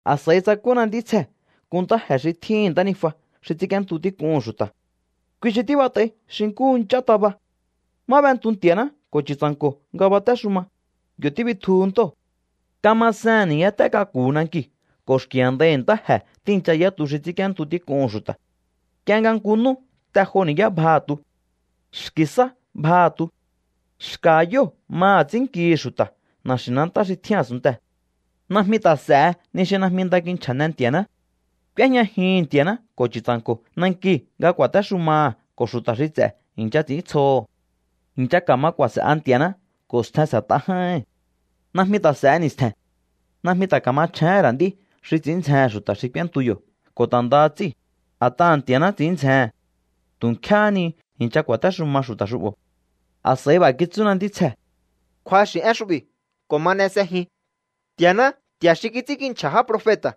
A̱s'a̱i tsakúna ntítsjee̱ nku ntáje̱ xi tjíhi̱n ntánijua xi ts'ínk'íéntu tík'uhu̱n xu̱ta̱. Kui xi tíbat'ai xi nkúhu nch'án taba. Má b'entu Nti̱a̱ná ko̱ Chu̱tsa̱nko̱ nga batéxuma, yo̱ tíbitjuhu ntóo̱. Kamasehe̱n ni̱yáté k'aku̱hu̱ nankiu̱ ko̱ xki̱ a̱ndaihi̱ ntáje̱ tíi̱ncha yá tu xi ts'ínk'íéntu tík'uhu̱n xu̱ta̱. Nk'ie nga nku nú te jo ni̱yá bjaha̱ tu. Xki̱ sá bjaha̱ tu. Xka̱ha̱ yóo̱ maha̱ ts'i̱ínnkihi̱ xu̱ta̱ na̱xi̱nantá xi tjín a̱sunntee̱. Najmi ta̱ s'e̱he ni xi najmi nda kinchja̱ne Nti̱a̱ná. K'úéjñajihi̱n Nti̱a̱ná ko̱ Chu̱tsa̱nko̱ nankiu̱ nga ku̱a̱téxumaha̱ ko̱ xu̱ta̱ xi ts'e̱ i̱ncha ts'i̱íntsjoho̱. I̱ncha ka̱ma ku̱a̱se̱'a Nti̱a̱ná ko̱ stjen s'e̱t'a j'áíhi̱n. Najmi ta̱ s'e̱he ni̱stje̱n. Najmi ta̱ ka̱machjéhe̱n ra̱ nd'í xi ts'i̱ín ndzjehe̱n xu̱ta̱ xi k'úéntu yo̱ ko̱ ta̱ ndaha ts'íu̱, a̱t'aha̱ Nti̱a̱ná ts'i̱ín ndzjehe̱n. Tu̱ nkjéhé ni i̱ncha ku̱a̱téxuma xu̱ta̱ xu'bo̱. A̱s'a̱i b'a̱ kitsúna ntítsjee̱: —Kju̱axi̱ én xu'bi̱ ko̱ ma n'e s'ejin. Nti̱a̱ná, Nti̱a̱ xi kits'ínkinchja̱ já profeta̱,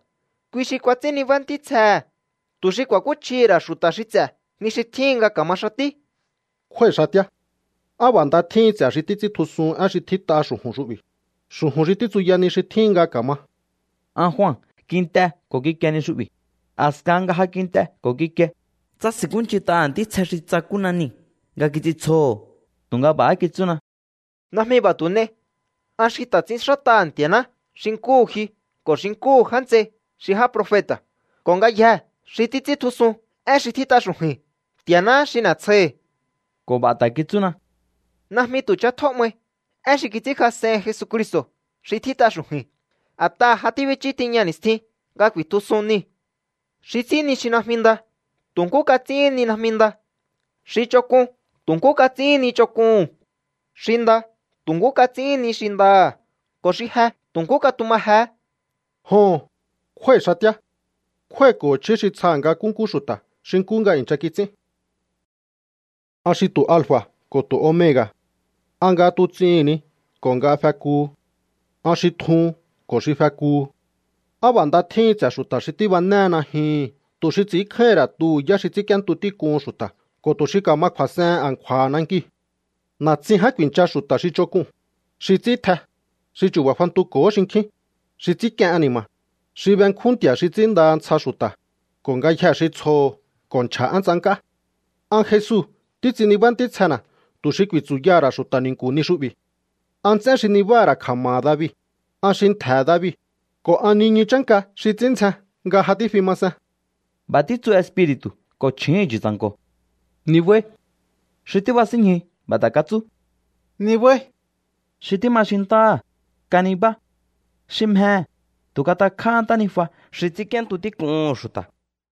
kui xi kuats'ín nibá ntítsjehe̱, tu̱ xi ku̱a̱kúchjihi̱ ra̱ xu̱ta̱ xi ts'e̱ ni xi tjíhin nga ka̱ma xatí. —¡Kjúái̱ xatíá! ¡Á b'a̱ nda tjíhin ts'e̱ xi títs'íntjusuhun én xi tjít'a xu̱ju̱n xu'bi̱, xu̱ju̱n xi títsuya ni xi tjíhin nga ka̱ma! An Jua kint'e ko̱ kikie ni xu'bi̱. A̱skahan nga ja kint'e ko̱ kikie, tsási̱nkúnch'int'aha̱ ntítsje xi tsakúna niu̱ nga kits'intsjoho̱. Tu̱nga b'a̱há kitsúna: —Najmi b'a̱ tu̱ n'ei. An xi ta̱ ts'inxát'aha̱ Nti̱a̱ná xi nkúhu ji ko̱ xi nkúhu já nts'ei xi já profeta̱ ko̱ ngayjee̱ xi títs'íntjusun én xi tjít'a xu̱ju̱i̱n. Nti̱a̱náhá xi n'e̱tsjoihi̱. Ko̱ b'a̱ ta̱ kitsúna: —Najmi tu̱ ch'atjó 'mai én xi kits'ínkjas'ehin Jesucristo̱ xi tjít'a xu̱ju̱i̱n. A̱t'aha̱ ja tíbichú tiña ni̱stjin nga ku̱i̱tjusun niu̱. Xi ts'ín ni xi najmi nda, tu̱ nkú kats'íhín ni najmi nda. Xi ch'onk'un, tu̱ nkú kats'íhín ni ch'onk'uhu̱n. Xi nda, tu̱ nkú kats'íhín ni xi ndaha̱. Ko̱ xi je, tu̱ nkú katuma jehé. —Joho̱n, kjúái̱ xatíá. Kjúái̱ko̱ho̱ chjí xi tsjaha̱ nga nkúnkú xu̱ta̱ xi nkú nga i̱ncha kits'ín. An xi ntu alfa̱ ko̱ ntu omega̱. An nga tuts'ihi̱n ni ko̱ nga fekuhu. An xi tjuhun ko̱ xi fekuhu. ¡Á b'a̱ nda tjíhin ts'e̱ xu̱ta̱ xi tíbanéhe najyuhu̱n tu̱ xi ts'i̱ínkjáíhi̱n ra̱ tuhu̱ yá xi ts'ínk'íéntu tík'uhu̱n xu̱ta̱ ko̱ tu̱ xi ka̱ma kju̱a̱s'ehen a̱nkju̱a̱ha̱ nankiu̱! Na̱tsin ján ku̱i̱ncha xu̱ta̱ xi ch'onk'uu̱n, xi ts'ín tj'e, xi chu̱ba̱ fantuko̱hó xinkjín, xi ts'ínk'ien ani̱ma̱, xi benkjún nti̱a̱ xi ts'ínndaha ntsja xu̱ta̱, ko̱ ngayjee̱ xi tsjoho̱ ko̱ nchja̱ én tsank'á. —An Jesu títs'in nibá ntítsjena̱ tu̱ xi ku̱i̱tsu̱yaha̱ ra̱ xu̱ta̱ ni̱nku̱ ni xu'bi̱. An nts'én xi nibáha̱ ra̱ kja̱ma̱ha̱ David, an xi ntje̱he̱ David, ko̱ an niñu chánka xi ts'ín ndzjen nga ja tífi ma see̱n. B'a̱ títsu Espiri̱tu̱ ko̱ chju̱úhu̱n Chu̱tsa̱nko̱: —¡Nibáí! Xi tíbasínñjuhu̱ b'a̱ ta̱ katsú: —¡Nibáí! Xi tíma xintáha̱, kanibá. Xi mjehe̱, tu̱ katakj'áhá ntánijua xi ts'ínk'íéntu tík'uhu̱n xu̱ta̱.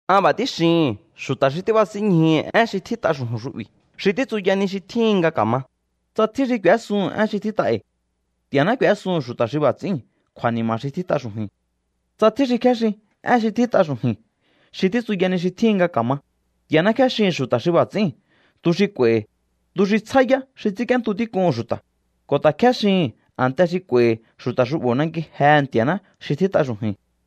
An b'a̱ tíxihi̱n xu̱ta̱ xi tíbasínñjuhu̱ én xi tjít'a xu̱ju̱n xu'bi̱ xi títsuya ni xi tjíhin nga ka̱ma: Tsa tjín xi k'u̱ésuhu̱n én xi tjít'a e̱i̱, Nti̱a̱ná k'u̱ésuhu̱n xu̱ta̱ xi b'a̱ ts'i̱íu̱n kju̱a̱ni̱ma̱ xi tjít'a xu̱ju̱i̱n. Tsa tjín xi kjéxin én xi tjít'a xu̱ju̱i̱n xi títsuya ni xi tjíhin nga ka̱ma, Nti̱a̱ná kjéxihi̱n xu̱ta̱ xi b'a̱ ts'i̱íu̱n tu xi k'u̱a̱i̱hi̱, tu xi tsjá yá xi ts'ínk'íéntu tík'uhu̱n xu̱ta̱, ko̱ ta̱ kjéxihi̱n a̱nte xi k'u̱a̱i̱hi̱ xu̱ta̱ xu'bo̱ nanki jehe̱ Nti̱a̱ná xi tjít'a xu̱ju̱i̱n.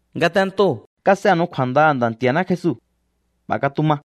Ngatentoo̱ kas'enu̱u kju̱a̱ndaha̱ Nda̱ Nti̱a̱ná Jesu. B'a̱ katuma.